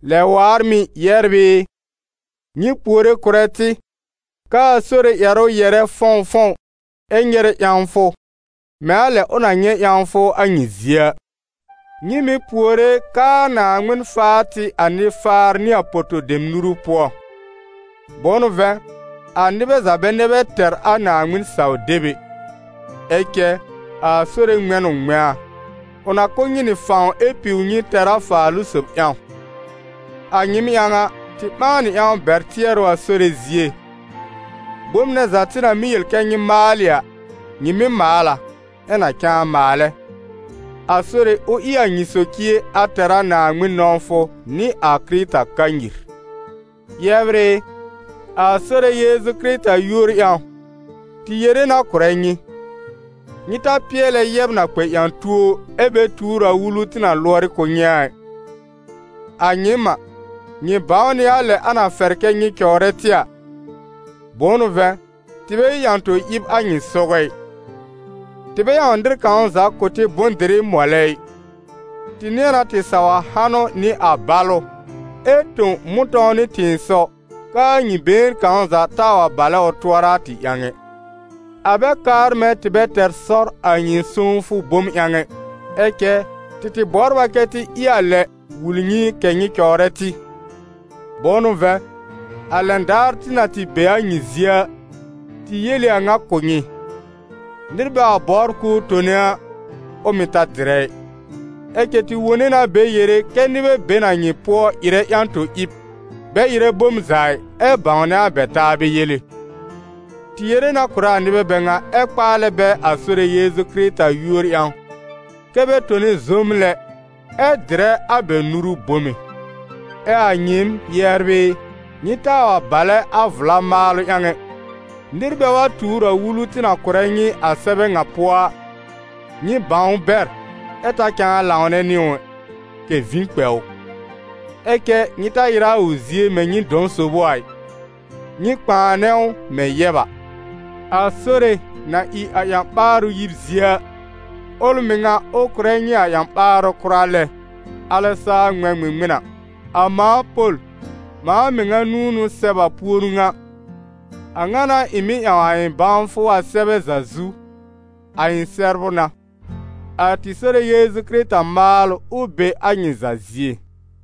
Lɛ waar mɩ̀, yɛbr ɩ, nyɩ puore kʋ̀rɛ tɩ, k'aa Sore ƴɛrʋ yɛ̀rɛ fɔ̃wfɔ̃w ɛ nyɛrɛ ƴãwfʋ, mɛ̃ a lɛ ʋ na nyɛ̃ ƴãwfʋ a nyɩ zie a. Nyɩ mɩ̀ puore k'aa Naaŋmɩn faa tɩ a nɩ-faar nɩ a poto-dem nuru pʋɔ; bʋ̃ʋ n'ʋ vɛ̃, a nɩbɛ za bɛ nɛ bɛ tɛr a Naaŋmɩn-saw-deb ɛ. Ɛ cɛ a Sore ŋmɛ̃ n ʋ ŋmɛ̃a: ʋ na kʋ̀ nyɩ nɩ fãw ɛ piw nyɩ tɛr a Faalʋ-sob ƴãw. A nyɩɩm ƴãw a, tɩ ɓãa nɩ ƴãw bɛr tɩɛrʋ a Sore zie: bom nɛ za tɩ na mɩ́ yel kɛ́ nyɩ maalɩ a, nyɩ mɩ́ maal a, ɛ na cãa maalɛ. A Sore, ʋ ɩ a nyɩ socie a tɛr a Naaŋmɩn nɔ̃wfʋ nɩ a Kɩrɩta kanyir. Yɛbr ɩ, a Sore Yeezu Kɩrɩta yúor ƴãw, tɩ yere na kʋ̀rɛ nyɩ: nyɩ ta pɩɛlɛ yɛb na kpɛ ƴã-tuo, ɛ bɛ tuur a wulu tɩ na lʋɔrɩ kʋ̀ nyɩ a ɩ. A nyɩɩm a, nyɩ bãw nɩ a lɛ a na fɛr kɛ́ nyɩ cɔwrɛ tɩ a: bʋ̃ʋ n'ʋ vɛ̃, tɩ bɛ ɩ ƴã-to-ɩb a nyɩ sɔgɔ ɩ. Tɩ bɛ ƴãw nɩr kãw za kʋ̀ tɩ bʋ̃-dɩrɩ mɔlɛ ɩ, tɩ nɩ̃ɛ na tɩ saw a hanʋ nɩ a balʋ ɛ tõ mʋ̃tɔ̃w nɩ tɩ̃ɩsɔw, k'aa nyɩ been kãw za taa wa balɛ ʋ tʋɔra a tɩ ƴãw ɛ. A bɛ kaar mɛ̃ tɩ bɛ tɛr sɔr a nyɩ sõwfʋ bom ƴãw ɛ, ɛ cɛ tɩ tɩ bɔbr a kɛ́ tɩ ɩ a lɛ wul nyɩ kɛ̀ nyɩ cɔwrɛ tɩ. Bʋ̃ʋ n'ʋ vɛ̃, a lɛn daar tɩ na tɩ be a nyɩ zie a, tɩ yel ɩ a ŋa kʋ̀ nyɩ: nɩr bɛ wa bɔbr k'ʋʋ tone a, ʋ mɩ̀ ta dɩrɛ ɩ. Ɛ cɛ tɩ wone na bɛ yere kɛ́ nɩbɛ be n a nyɩ pʋɔ ɩrɛ ƴã-to-ɩb, bɛ ɩrɛ bom za ɩ, ɛ bãwnɛ a bɛ taabɛ yele. Tɩ yere na kʋ̀rɛ a nɩbɛ bɛ ŋa, ɛ kpaalɛ bɛ a Sore Yeezu Kɩrɩta yúor ƴãw, kɛ́ bɛ tone zoom lɛ, ɛ dɩrɛ a bɛ nuru bome. Ɛ a nyɩɩm, yɛbr ɩ, nyɩ taa wa balɛ a vla maalʋ ƴãw ɛ. Nɩr bɛ wa tuur a wulu tɩ na kʋ̀rɛ nyɩ a sɛbɛ ŋa pʋɔ a, nyɩ bãw ʋ bɛr, ɛ ta cãa lãwnɛ nɩ ʋ ɛ, kɛ̀ vĩ kpɛ ʋ. Ɛ cɛ nyɩ ta ɩrɛ a ʋ zie mɛ̃ nyɩ dɔ̃ sob ʋ a ɩ, nyɩ kpãanɛ ʋ mɛ̃ yɛb a. A Sore na ɩ a ƴã-ɓaarʋ yib zie a, ʋl mɩŋa, ʋ kʋ̀rɛ nyɩ a ƴã-ɓaarʋ kʋra lɛ, alɛ saa ŋmɛ̃ ŋmɩŋmɩn a. A mãa Pol, mãa mɩŋa nũu n'ʋ sɛb a puoru ŋa. A ŋa n'a ɩ̃ mɩ́ ƴãw a ɩ̃ bãwfʋ a sɛbɛ za zu: a ɩ̃ sɛbrʋ n'a. A tɩ Sore Yeezu Kɩrɩta maalʋ, ʋ be a nyɩ za zie.